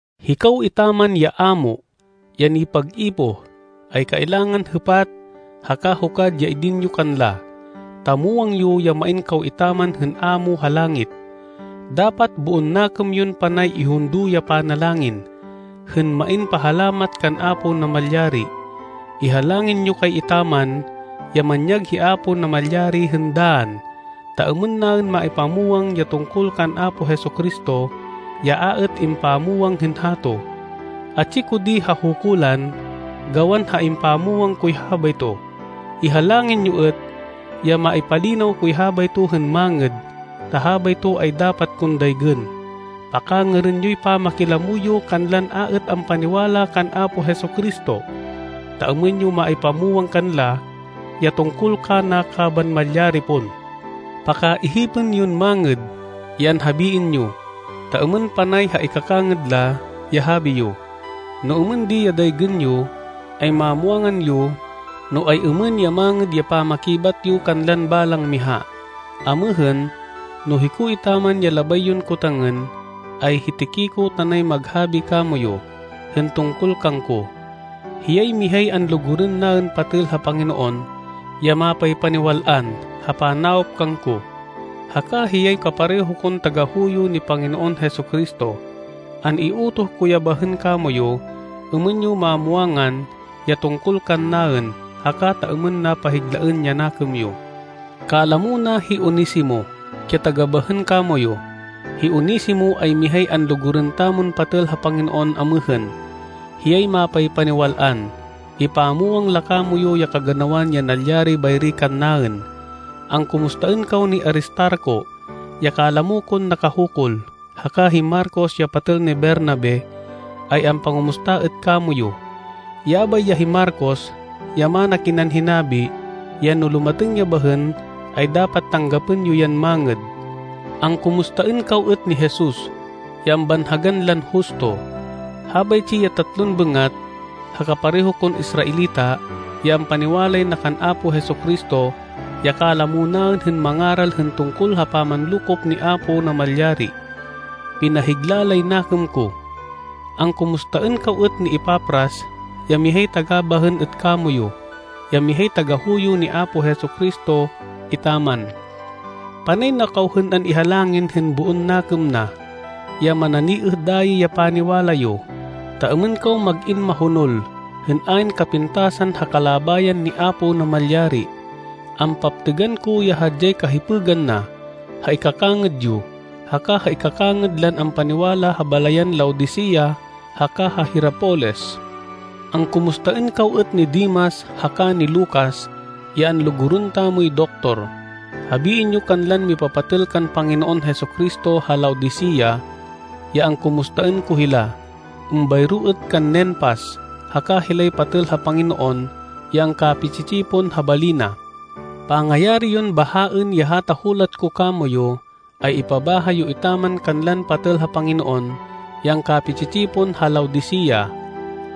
Hikaw etaman ya ámo, ya nipag-ipoh, ay kailangan hêpat, haka hukad ya idin yo kanla, ta muwang yo ya main kaw etaman hên Amo ha langit. Dapat boon nakêm yon panay ihundo ya panalangin, hên main pahalamat kan Apo Namalyari. Ihalangin yo kay etaman, ya manyag hi Apo Namalyari hên dann, ta êmên naên maipamwang ya tungkol kan Apo Jesu-Cristo, ya a êt impamwang hên hato. Atsi ko di ha hukulan, gawan ha impamwang koy habayto. Ihalangin yo êt, ya maipalinaw koy habayto hên mangêd, ta habayto ay dapat kon daygên. Pakangêrên yoy pamakilamo yo kanlan a êt ampaniwala kan Apo Jesu-Cristo, ta êmên yo maipamwang kanla, ya tungkol kana kaban malyari pon. Pakaihipên yon mangêd, ya anhabiên yo, ta êmên panay ha ikakangêd la, ya habi yo. No êmên di ya daygên yo, ay mamwangan yo, no ay-êmên ya mangêd ya pamakibat yo kanlan balang miha. Amêhên, no hiko etaman ya labay yon kotangên, ay hi Tiquico tanay maghabi kamoyu, hên tungkol kangko. Hiyay mihay anlugurên naên patêl ha Panginoon, ya mapaypaniwal-an ha panawop kangko, haka hiyay kapareho kon tagahuyo ni Panginoon Jesu-Cristo. An-iutoh ko ya bahên kamoyu, êmên yo mamwangan, ya tungkol kannaên, haka ta êmên na pahiglaên ya nakêm yo. Kalamo na hi Onesimo, ya taga bahên kamoyu. Hi Onesimo ay mihay anlugurên tamon patêl ha Panginoon amêhên. Hiyay mapaypaniwal-an. Ipamwang la kamoyu ya kaganawan ya nalyari bayri kannaên. Angkumustaên kaw ni Aristarco, ya kalamo kon nakahukul, haka hi Marcos ya patêl ni Bernabe, ay ampangumusta êt kamoyu. Yabay ya hi Marcos, ya mana kinan hinabi, ya no lumatêng ya bahên, ay dapat tanggapên yo yan mangêd. Angkumustaên kaw êt ni Jesus, ya ambanhagan lan Justo. Habaytsi ya tatlon bêngat, ha kapareho kon Israelita, ya ampaniwalay na kan Apo Jesu-Cristo, ya kalamo naên hên mangaral hên tungkol ha pamanlokop ni Apo Namalyari. Pinahigla lay nakêm ko. Angkumustaên kaw êt ni Epafras, ya mihay taga bahên êt kamoyu, ya mihay tagahuyo ni Apo Jesu-Cristo etaman. Panay na kaw hên an-ihalangin hên boon nakêm na, ya mananiêh dayi ya paniwala yo, ta êmên kaw mag-in mahonol, hên ayn kapintasan ha kalabayan ni Apo Namalyari. Ampaptêgan ko ya hadyay kahipêgan na, ha ikakangêd yo, haka ha ikakangêd lan ampaniwala ha balayan Laodicea haka ha Hierapolis. Angkumustaên kaw êt ni Demas haka ni Lucas, ya anlugurên tamoy doktor. Habiên yo kanlan mipapatêl kan Panginoon Jesu-Cristo ha Laodicea ya angkumustaên ko hila. Êmbayro êt kan Ninfas, haka hilay patêl ha Panginoon ya angkapi-tsi-tsipon ha bali na. Pangayari yon bahaên ya hata hulat ko kamoyu, ay ipabaha yo etaman kanlan patêl ha Panginoon ya angkapi-tsi-tsipon ha Laodicea.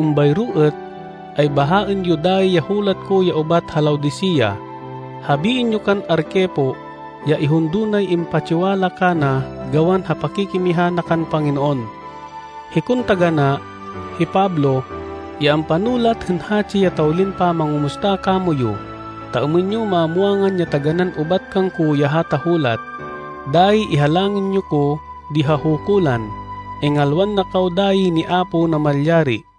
Êmbayro êt, ay bahaên yo dayi ya hulat ko ya ubat ha Laodicea. Habiên yo kan Arquipo ya ihundo nay impatsiwala kana gawan ha pakikimiha na kan Panginoon. Hikon taganá, hi Pablo, ya ampanulat hên hatsi ya tawlin pamangumusta kamoyu, ta êmên yo mamwangan ya taganán ubat kangko ya hata hulat. Dayi ihalangin yo ko di ha hukulan. Ingalwan na kaw dayi ni Apo Namalyari.